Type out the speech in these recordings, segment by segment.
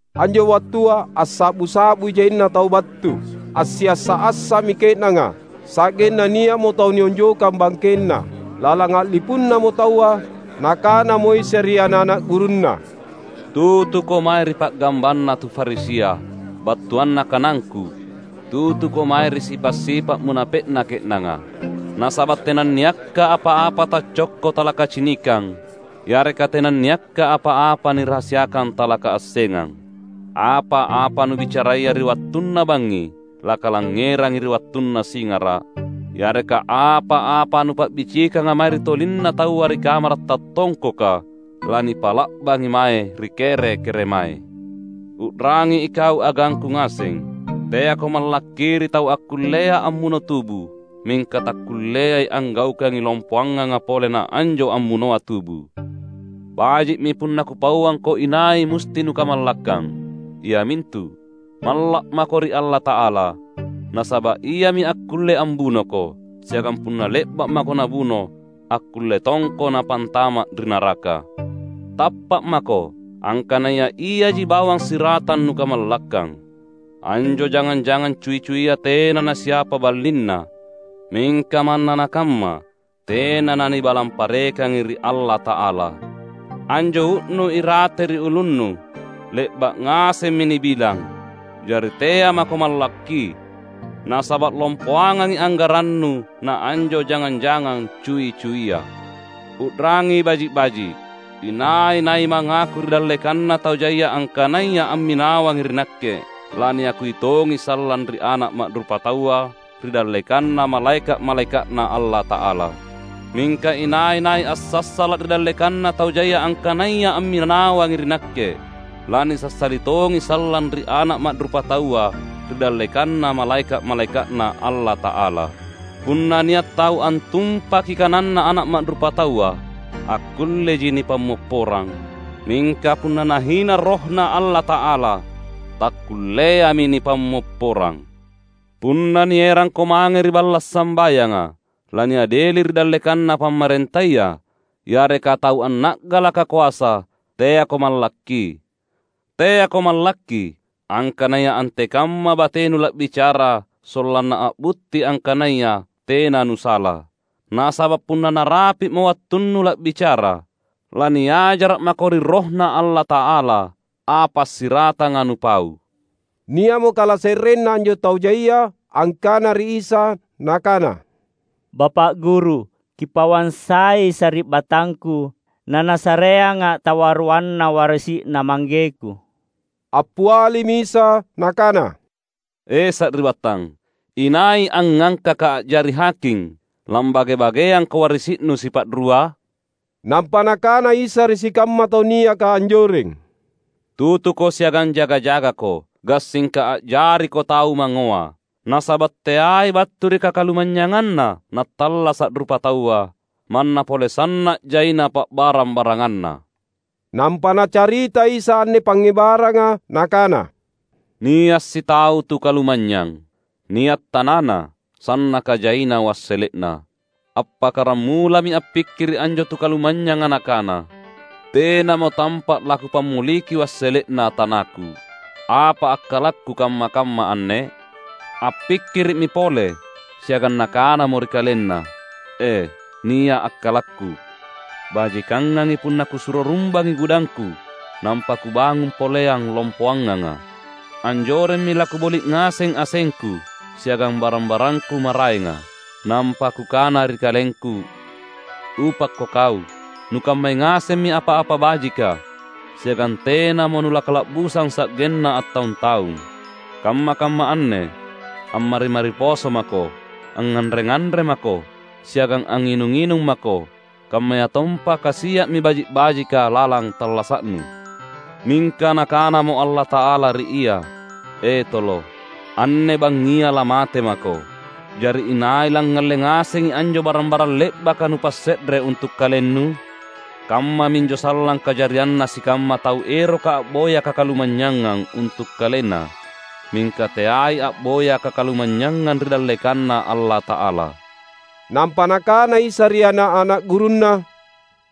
Anjo wattua assa’bu-sa’bui jaina tau battu. Assiassa’-assa’mi ke’nanga, sa’genna nia’mo tau nionjokang bangkenna. Lalang a’lipunnamo taua, Nakanamo Isa ri ana’-ana’ gurunNa, "Tutuko mae ri pa’gambanna tu Farisia. Battuanna kanangKu, tutuko mae ri sipa’-sipa’ munape’na ke’nanga. Nasaba’ tenanniakka apa-apa taccokko talakacinikang; yareka tenanniakka apa-apa nirahasiakang talakaassengang. Apa-apa nubicaraya ri wattunna bangngi, lakalangngerangi ri wattunna singara’; yareka apa-apa nupa’bicikanga mae ri tolinna taua ri kamara’ tattongkoka, lanipa’la’bangi mange ri kere-keremae." "U’rangi ikau agangKu ngaseng! Teako mallakki ri tau akkullea ammuno tubu mingka takkulleai anggaukangi lompoanganga pole naanjo ammunoa tubu. Baji’mi punna Kupauangko inai musti nukamallakkang. Iamintu, malla’ mako ri Allata’ala. Nasaba’ Iami akkulle ambunoko, siagang punna le’ba’ mako Nabuno, akkulle tongko’ Napantama’ ri naraka! Tappa’ mako, angkanaya Iaji bawang siratang nukamallakkang. Anjo jangang-jangang cui-cuia tena nasiapa ballinna; mingka manna nakamma tena nanibalang parekangi ri Allata’ala. Anjo uu’nu irate ri ulunnu le’ba’ ngasemmi nibilang; jari tea’ mako mallakki. Nasaba’ lompoangangi anggarannu naanjo jangang-jangang cui-cuia!" "U’rangi baji’-baji’: Inai-nai mangaku ri dallekanna tau jaia angkanaya amminawangi ri Nakke, laniakui tongi sallang ri Ana’ Ma’rupataua ri dallekanna malaeka’-malaeka’Na Allata’ala. Mingka inai-nai assassala’ ri dallekanna tau jaia angkanaya amminawangi ri Nakke, lanisassali tongi sallang ri Ana’ Ma’rupataua ri dallekanna malaeka’-malaeka’Na Allata’ala. Punna nia’ tau antumpaki kananNa Ana’ Ma’rupataua akkulleji nipammopporang; mingka punna nahina RohNa Allata’ala, takkulleami nipammopporang. Punna nierangko mange ri balla’ sambayanga laniadeli ri dallekanna pamarentaya yareka tau anna’galaka koasa, teako mallakki. Teako mallakki angkanaya antekamma batenu la’bicara sollanna a’butti angkanaya tena nusala. Nasaba’ punna narapi’mo wattunnu la’bicara, laniajara’ mako ri RohNa Allata’ala apa siratanga nupau." Nia’mo kalase’renna anjo tau jaia angkana ri Isa, nakana, "Bapa’ Guru, Kipauang sai sari’battangku nanasareanga’ tawaruanna warisi’na manggeku." Appialimi Isa Nakana, "E, sari’battang, inai angngangkaKa’ a’jari haking, lambage-bageangko warisi’nu sipa’rua?" Nampa Nakana Isa ri sikamma tau niaka anjoreng, "Tutuko siagang jaga-jagako, gassingka a’jariko tau mangngoa. Nasaba’ teai battu ri kakalumanynyanganna nattallasa’ rupataua, manna pole sanna’ jaina pa’barang-baranganna." Nampa Nacarita Isa anne pangngebaranga Nakana, "Nia’ sitau tu kalumanynyang. Nia’ tanana, sannaka jaina wassele’na. Appakkaramulami appikkiri’ anjo tu kalumanynyanga nakana, ‘Tenamo tampa’ lakupammoliki wassele’na tanaku. Apa akkalakku kamma-kamma anne?’ Appikkiri’mi pole, siagang nakanamo ri kalenna, ‘E, nia’ akkalakku; bajikangangi punna kusuro rumbangi gudangku, nampa kubangung poleang lompoanganga. Anjoremmi lakuboli’ ngaseng asengku siagang barang-barangku maraenga. Nampa kukana ri kalengku: Upakko kau! Nukammai ngasemmi apa-apa bajika, siagang tenamo nulakala’busang sa’genna attaung-taung. Kamma-kamma anne ammari-mari poso mako! Angnganre-nganre mako, siagang angnginung-nginung mako, kammayatompa kasia’mi baji’-bajika lalang tallasa’nu!’ Mingka Nakanamo Allata’ala ri ia, ‘E tolo! Anne bangngia lamate mako; jari inai langngalle ngasengi anjo barang-barang le’baka nupasse’re untu’ kalennu?’ Kammaminjo sallang kajarianna sikamma tau eroka a’boya kakalumanynyangang untu’ kalenna, mingka teai a’boya kakalumanynyangang ri dallekanNa Allata’ala." Nampa Nakana Isa ri ana’-ana’ gurunNa,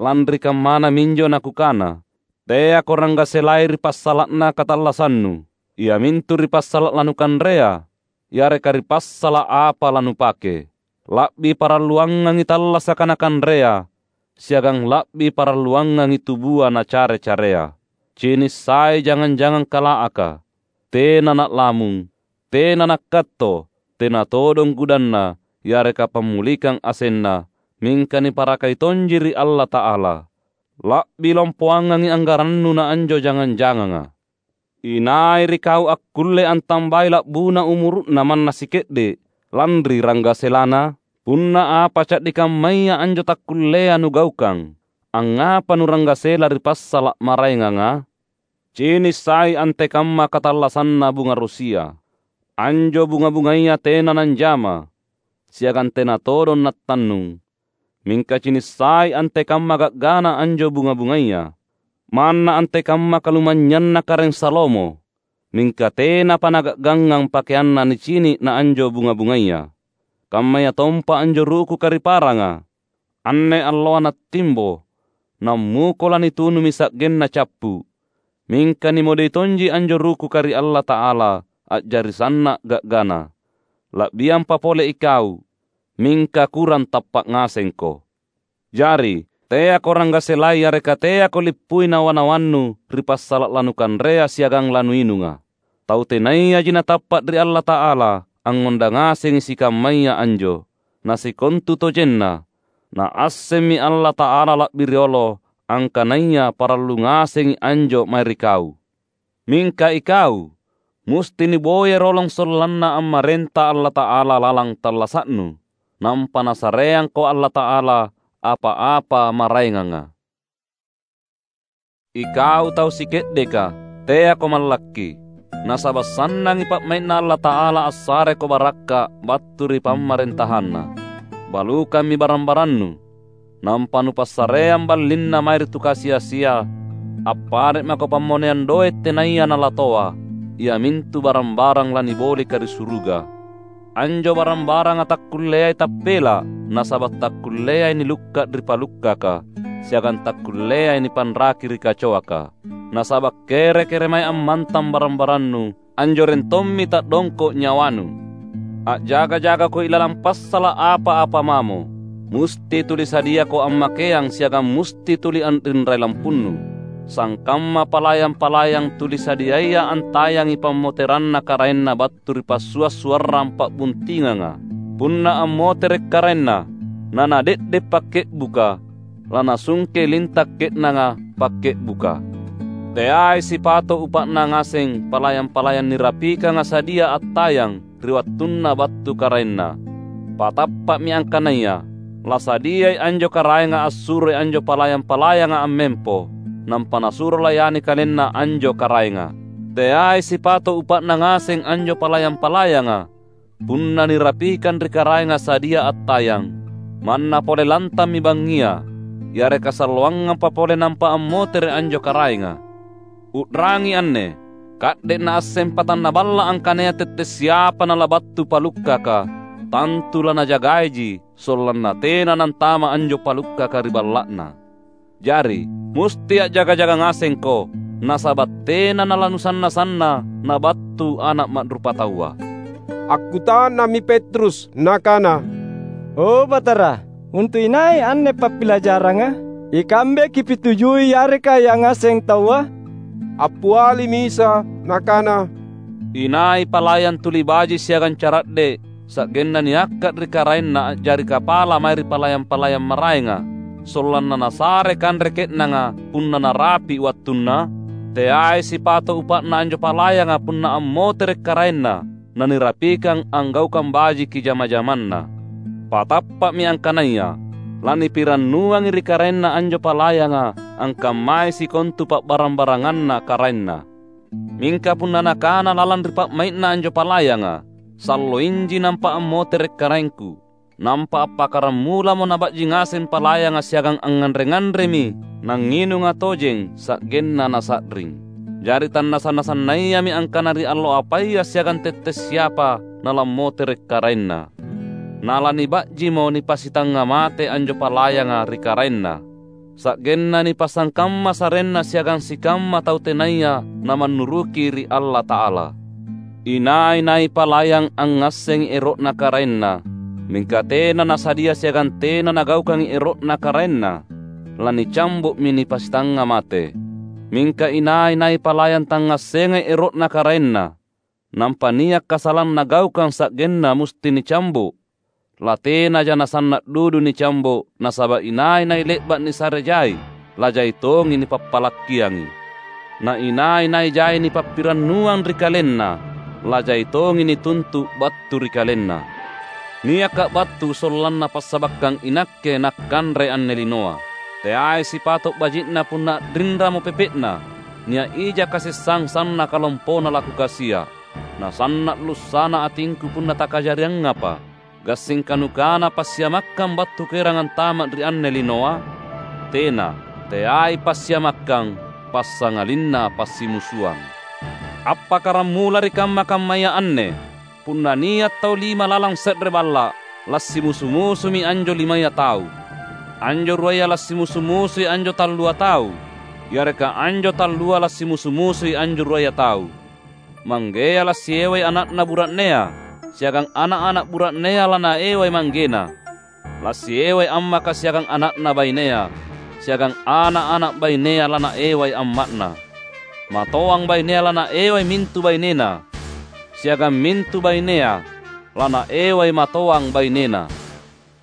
"Lanri kammana minjo naKukana, ‘Teako ranggaselai ri passala’na katallassannu, iamintu ri passala’ lanukanrea, yareka ri passala’ apa lanupake.’ La’bi paralluangangi tallasaka na kanrea, siagang la’bi paralluangangi tubua na care-carea. Cinissai jangang-jangang kalaaka! Tena na’lamung, tena nakkatto, tena todong gudanna yareka pammolikang asenna. Mingka niparakai tonji ri Allata’ala! La’bi lompoangangi anggarannu na anjo jangang-janganga! Inai ri kau akkulle antambai la’buna umuru’na manna sike’de’, lanri ranggaselana? Punna apa ca’di kammaya anjo takkullea nugaukang, angngapa nuranggasela ri passala’ maraenganga? Cinissai antekamma katallassanna bunga rosia; anjo bunga-bungaya tena nanjama, siagang tena todong nattannung. Mingka cinissai antekamma ga’gana anjo bunga-bungaya. Manna antekamma kalumanynyanna Karaeng Salomo mingka tenapa naga’gangngang pakeanna nicini’ na anjo bunga-bungaya! Kammayatompa anjo rukuka ri paranga; anne alloa nattimbo, nammuko lanitunumi sa’genna cappu’. Mingka nimodei tonji anjo rukuka ri Allata’ala, a’jari sanna’ ga’gana. La’biampa pole ikau! Mingka kurang tappa’ ngasengko! Jari, teako ranggaselai yareka teako lippui nawa-nawannu ri passala’ lanukanrea siagang lanuinunga. Tau tenayaji natappa’ ri Allata’ala angngondang ngasengi sikammaya anjo. Na sikontutojenna, Naassemmi Allata’ala la’bi riolo angkanaya parallu ngasengi anjo mae ri kau. Mingka ikau, musti nuboyai rolong sollanna ammarenta Allata’ala lalang tallasa’nu, nampa Nasareangko Allata’ala apa-apa maraenganga." "Ikau tau sike’deka, teako mallakki! Nasaba’ sannangi pa’mai’Na Allata’ala assareko barakka’ battu ri PamarentahanNa. Balukammi barang-barannu, nampa nupassareang ballinna mae ri tu kasi-asia. Appare’ mako pammoneang doe’ tenaya nalatoa, iamintu barang-barang lanibolika ri suruga. Anjo barang-baranga takkulleai tappela’, nasaba’ takkulleai nilukka’ ri palukkaka, siagang takkulleai nipanraki ri kacoaka. Nasaba’ kere-keremae ammantang barang-barannu, anjoreng tommi ta’dongko’ nyawanu!" "A’jaga-jagako ilalang passala’ apa-apa mamo. Musti tuli sadiako ammakeang siagang musti tuli a’rinrai lampunnu; sangkamma palayang-palayang tuli sadiaya antayangi pammoteranna karaenna battu ri passua’-suarrang pa’buntinganga. Punna ammotere’ karaenna na nade’de’ pakke’buka, lanasungkei linta’ ke’nanga pakke’buka. Teai sipato’ upa’na ngaseng palayang-palayang nirapikanga sadia attayang ri wattunna battu karaenna. Patappa’mi angkanaya: lasadiai anjo karaenga assuroi anjo palayang-palayanga ammempo, nampa nasuro layani kalenna anjo karaenga. Teai sipato’ upa’na ngaseng anjo palayang-palayanga punna nirapikang ri karaenga sadia attayang, manna pole lantammi bangngia yareka salloangampa pole nampa ammotere’ anjo karaenga. U’rangi anne! Ka’de’ naasseng patanna balla’ angkanaya tette’ siapa nalabattu palukkaka, tantu lanajagaiji sollanna tena nantama’ anjo palukkaka ri balla’na. Jari, musti a’jaga-jaga ngasengko, nasaba’ tena nalanusanna-sanna Nabattu Ana’ Ma’rupataua." Akkuta’nammi Petrus nakana, "O Batara, untu’ inai anne pappilajaranga? Ikambe Kipitujui yareka yangaseng taua?" Appialimi Isa Nakana, "Inai palayang tuli baji’ siagang cara’de’ sa’genna niangka’ ri karaenna a’jari kapala mae ri palayang-palayang maraenga, sollanna nasare kanre ke’nanga punna narapi’ wattunna? Teai sipato’ upa’na anjo palayanga punna ammotere’ karaenna nanirapikang anggaukang bajiki jama-jamanna! Patappa’mi angkanaya: Lanipirannuangi ri karaenna anjo palayanga angkammai sikontu pa’barang-baranganna karaenna. Mingka punna nakana lalang ri pa’mai’na anjo palayanga, ‘Salloinji nampa ammotere’ karaengku,’ nampa appakkaramulamo naba’ji ngaseng palayanga siagang angnganre-nganremi nangnginunga tojeng sa’genna nasa’ring. Jari tanasanna-sannayami angkana ri allo apaya siagang tette’ siapa nalammotere’ karaenna. Na laniba’jimo nipasitangnga mate anjo palayanga ri karaenna, sa’genna nipasangkamma sarenna siagang sikamma tau tenaya namannuruki ri Allata’ala. Inai-nai palayang angngassengi ero’na karaenna, mingka tena nasadia siagang tena nagaukangi ero’na karaenna, lanicambo’mi nipasitangnga mate. Mingka inai-nai palayang tangngassengai ero’na karaenna, nampa nia’ kasalang nagaukang sa’genna musti nicambo’, latenaja nasanna’ dudu nicambo’. Nasaba’ inai-nai le’ba’ nisare jai, lajai tongi nipappalakkiangi. Na inai-nai jai nipappirannuang ri kalenna, lajai tongi nituntu’ battu ri kalenna." "NiakKa’ battu sollanna passabakkang iNakke nakkanre anne linoa. Teai sipato’ baji’na punna a’rinramo pepe’na! Nia’ ija kasessang sannaka lompona laKukasia’. Nasanna’ lussa’na atingKu punna takajariangapa. Gassingka nukana passiamakkang battu Kuerang antama’ ri anne linoa? Tena, teai passiamakkang, passangalinna passimusuang. Appakkaramula ri kamma-kammaya anne, punna nia’ tau lima lalang se’re balla’, lasimusu-musumi anjo limaya tau. Anjo ruaya lasimusu-musui anjo tallua tau, yareka anjo tallua lasimusu-musui anjo ruaya tau. Manggea lasiewai ana’na bura’nea, siagang ana’-ana’ bura’nea lanaewai manggena. Lasiewai ammaka siagang ana’na bainea, siagang ana’-ana’ bainea lanaewai amma’na. Matoang bainea lanaewai mintu bainena, siagang mintu bainea lanaewai matoang bainena."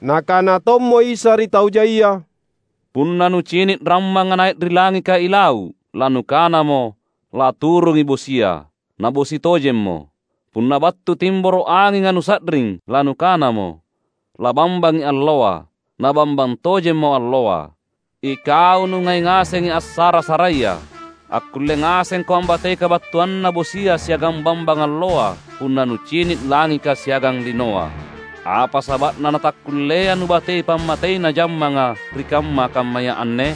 Nakana tommo Isa ri tau jaia, "Punna nucini’ rammanga nai’ ri langika ilau’, lanukanamo, ‘Laturungi bosia.’ Nabosi tojemmo. Punna battu timboro’ anginga nusa’ring, lanukanamo, ‘Labambangi alloa.’ Na bambang tojemmo alloa. Ikau nungai ngasengi assara-saraia. Akkulle ngasengko ambatei kabattuanna bosia siagang bambang alloa punna nucini’ langika siagang linoa. Apa saba’na natakkullea nubatei pammateina jammanga ri kamma-kammaya anne?"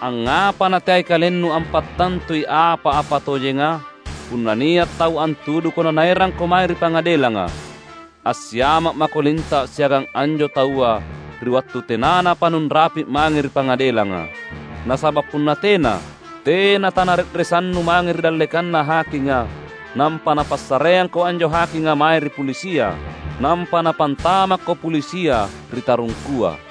"Angngapa nateai kalennu ampattantui apa-apa tojenga? Punna nia’ tau antuduko nanaerangko mange ri pangadelanga, assiama’ mako linta’ siagang anjo taua ri wattu tenanapa nunrapi’ mange ri pangadelanga. Nasaba’ punna tena, tena tanare’resannu mange ri dallekanna hakinga; nampa napassareangko anjo hakinga mae ri pulisia; nampa napantamakko pulisia ri tarungkua.